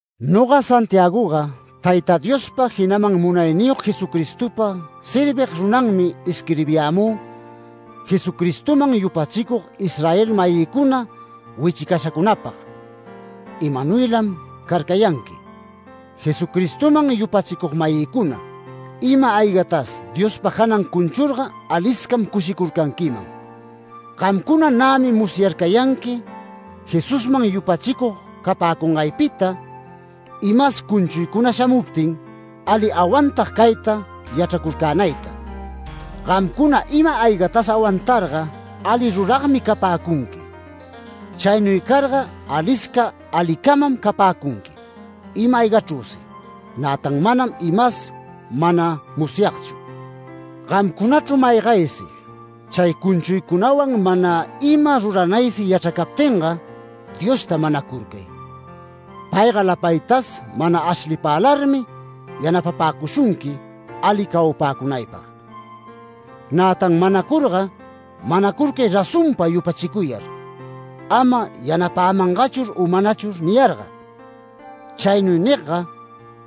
Noga Santiagoga Tayta Diospa, jinaman munayniyog Jesucristopa servig runanmi isquirbiyämü Jesucristoman yupachicug Israel-mayïcuna wichicashacunapag. ¡Imanuylam carcayanqui! Jesucristoman yupachicug-mayïcuna, ima-aygatas Diospa janan cunchurga aliscam cushicurcanquiman. Gamcuna nämi musyarcayanqui, Jesusman yupachicug capäcungaypita imas cunchuycuna shamuptin, ali awantag cayta yachracurcänayta. Gamcuna ima-aygatas awantarga ali ruragmi capäcunqui. Chaynuy carga alisca alicamam capäcunqui ima-aygachrüsi, nätan manam, imas mana musyagchu. Gamcunachru maygaysi, chay cunchuycunawan mana ima ruranaysi yachracaptinga Diosta manacurcay. Payga lapaytas mana ashlipälarmi yanapapäcushunqui ali cawapäcunaypag. Nätan manacurga manacurcay razonpa yupachicuyar, ama “Yanapämangachur u manachur” niyarga. Chaynuy nigga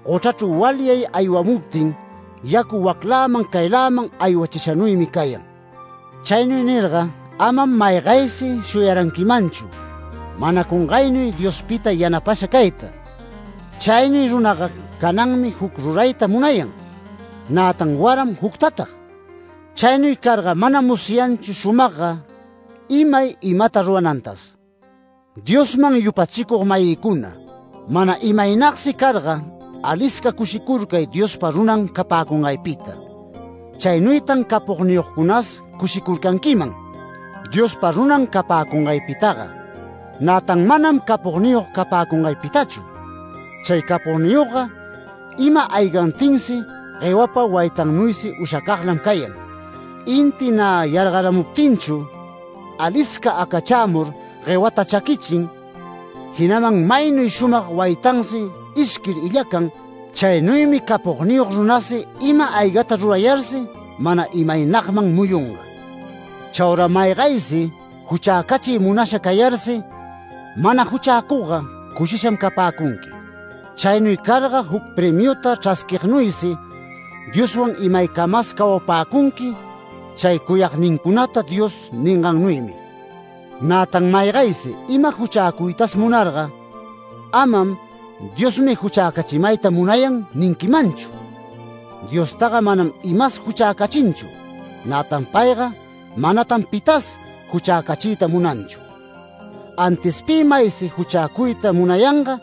gochrachru walyay walyamuptin yacu wacläman cayläman aywachishanuymi cayan. Chaynuy nirga, amam maygaysi shuyaranquimanchu manacungaynuy Diospita yanapasha cayta. Chaynuy runaga cananmi juc rurayta munayan, nätan waram juctatag. Chaynuy carga manam musyanchu shumagga imay imata ruranantas. Diosman yupachicug-mayïcuna, mana imaynagsi carga, alisca cushicurcay Diospa runan capäcungaypita. Chaynuytan capogniyogcunas cushicurcanquiman, Diospa runan capäcunganpitaga, nätan manam capogniyog capäcungaypitachu. Chay capogniyogga ima-aygantinsi guewapa waytannuysi ushacaglam cayan. Inti nä yargaramuptinchu, alisca acachämur, guewata chaquichin, jinaman maynuy shumag waytansi ishquir illacan. Chaynuymi capogniyog runasi ima-aygata rurayarsi mana imaynagman muyunga. Chaura maygaysi juchäcachiy munasha cayarsi mana juchäcugga cushisham capäcunqui. Chaynuy carga juc premiuta chrasquignuysi Dioswan imaycamas cawapäcunqui chay cuyagnincunata Dios ningannuymi. Nätan maygaysi ima juchäcuytas munarga amam “Diosmi juchäcachimayta munayan” ninquimanchu. Diostaga manam imas juchäcachinchu, nätan payga manatan pitas juchäcachiyta munanchu. Antis pi maysi juchäcuyta munayanga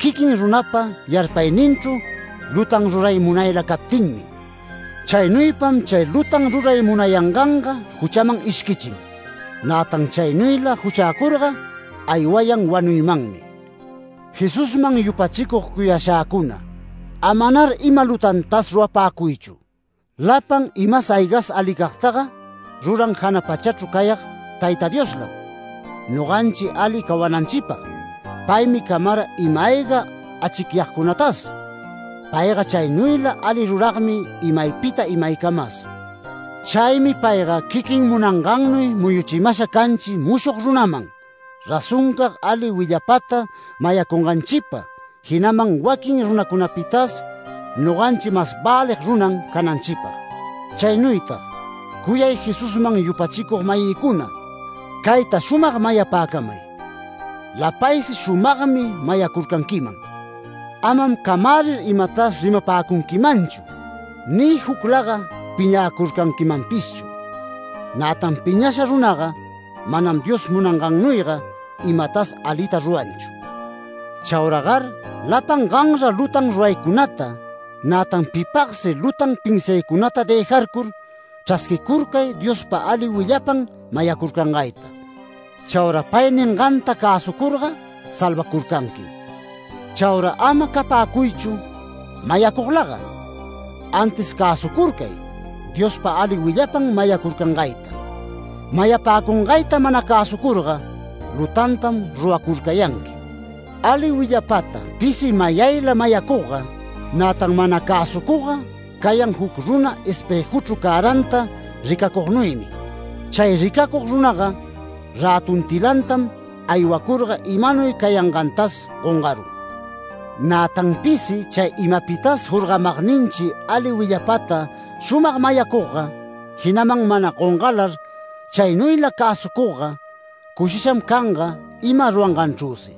quiquin runapa yarpayninchru lutan ruray munayla captinmi. Chaynuypam chay lutan ruray munayanganga juchaman ishquichin. Nätan chaynuyla juchäcurga aywayan wanuymanmi. Jesusman yupachicug cuyashäcuna, amanar ima lutantas rurapäcuychu. Lapan imas aygas alicagtaga ruran jana pachachru cayag Tayta Dioslam, noganchi ali cawananchipag. Paymi camara ima-ayga achicyagcunatas. Payga chaynuyla ali ruragmi imaypita imaycamas. Chaymi payga quiquin munangannuy muyuchimasha canchi mushog runaman, razoncag ali willapata mayacunganchipa, jinaman waquin runacunapitas noganchi mas välig runan cananchipag. Chaynuytag cuyay Jesusman yupachicug-mayïcuna, cayta shumag mayapäcamay: Lapaysi shumagmi mayacurcanquiman. Amam camärir imatas rimapäcunquimanchu ni juclaga piñäcurcanquimanpishchu. Nätan piñasha runaga manam Dios munangannuyga imatas alita ruranchu. Chauragar lapan ganra lutan ruraycunata, nätan pipagsi lutan pinsiaycunata dëjarcur chrasquicurcay Diospa ali willapan mayacurcangayta. Chaura pay ninganta cäsucurga salvacurcanquim. Chaura ama capäcuychu mayacuglaga. Antis cäsucurcay Diospa ali willapan mayacurcangayta. Mayapäcungayta mana cäsucurga lutantam ruracurcayanqui. Ali willapata pisi mayayla mayacugga, nätan mana cäsucugga cayan juc runa espëjuchru cäranta ricacugnuymi. Chay ricacug runaga rätuntilantam aywacurga imanuy cayangantas gongarun. Nätan pisi chay imapitas jorgamagninchi ali willapata shumag mayacugga, jinaman mana gongalar chaynuyla cäsucugga, cushisham canga ima ruranganchrüsi.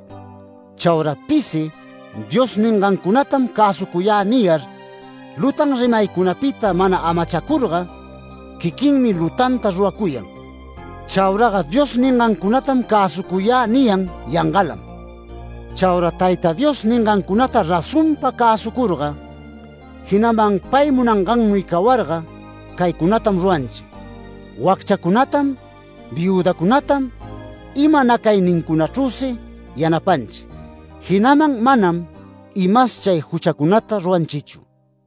Chaura pisi “Dios ningancunatam cäsucuyä” niyar, lutan rimaycunapita mana amachacurga, quiquinmi lutanta ruracuyan. Chauraga “Dios ningancunatam cäsucuyä” niyan yangalam. Chaura Tayta Dios ningancunata razonpa cäsucurga, jinaman pay munangannuy cawarga caycunatam ruranchi: Wacchacunatam viüdacunatam ima nacaynincunachrüsi yanapanchi, jinaman manam imas chay juchacunata ruranchichu.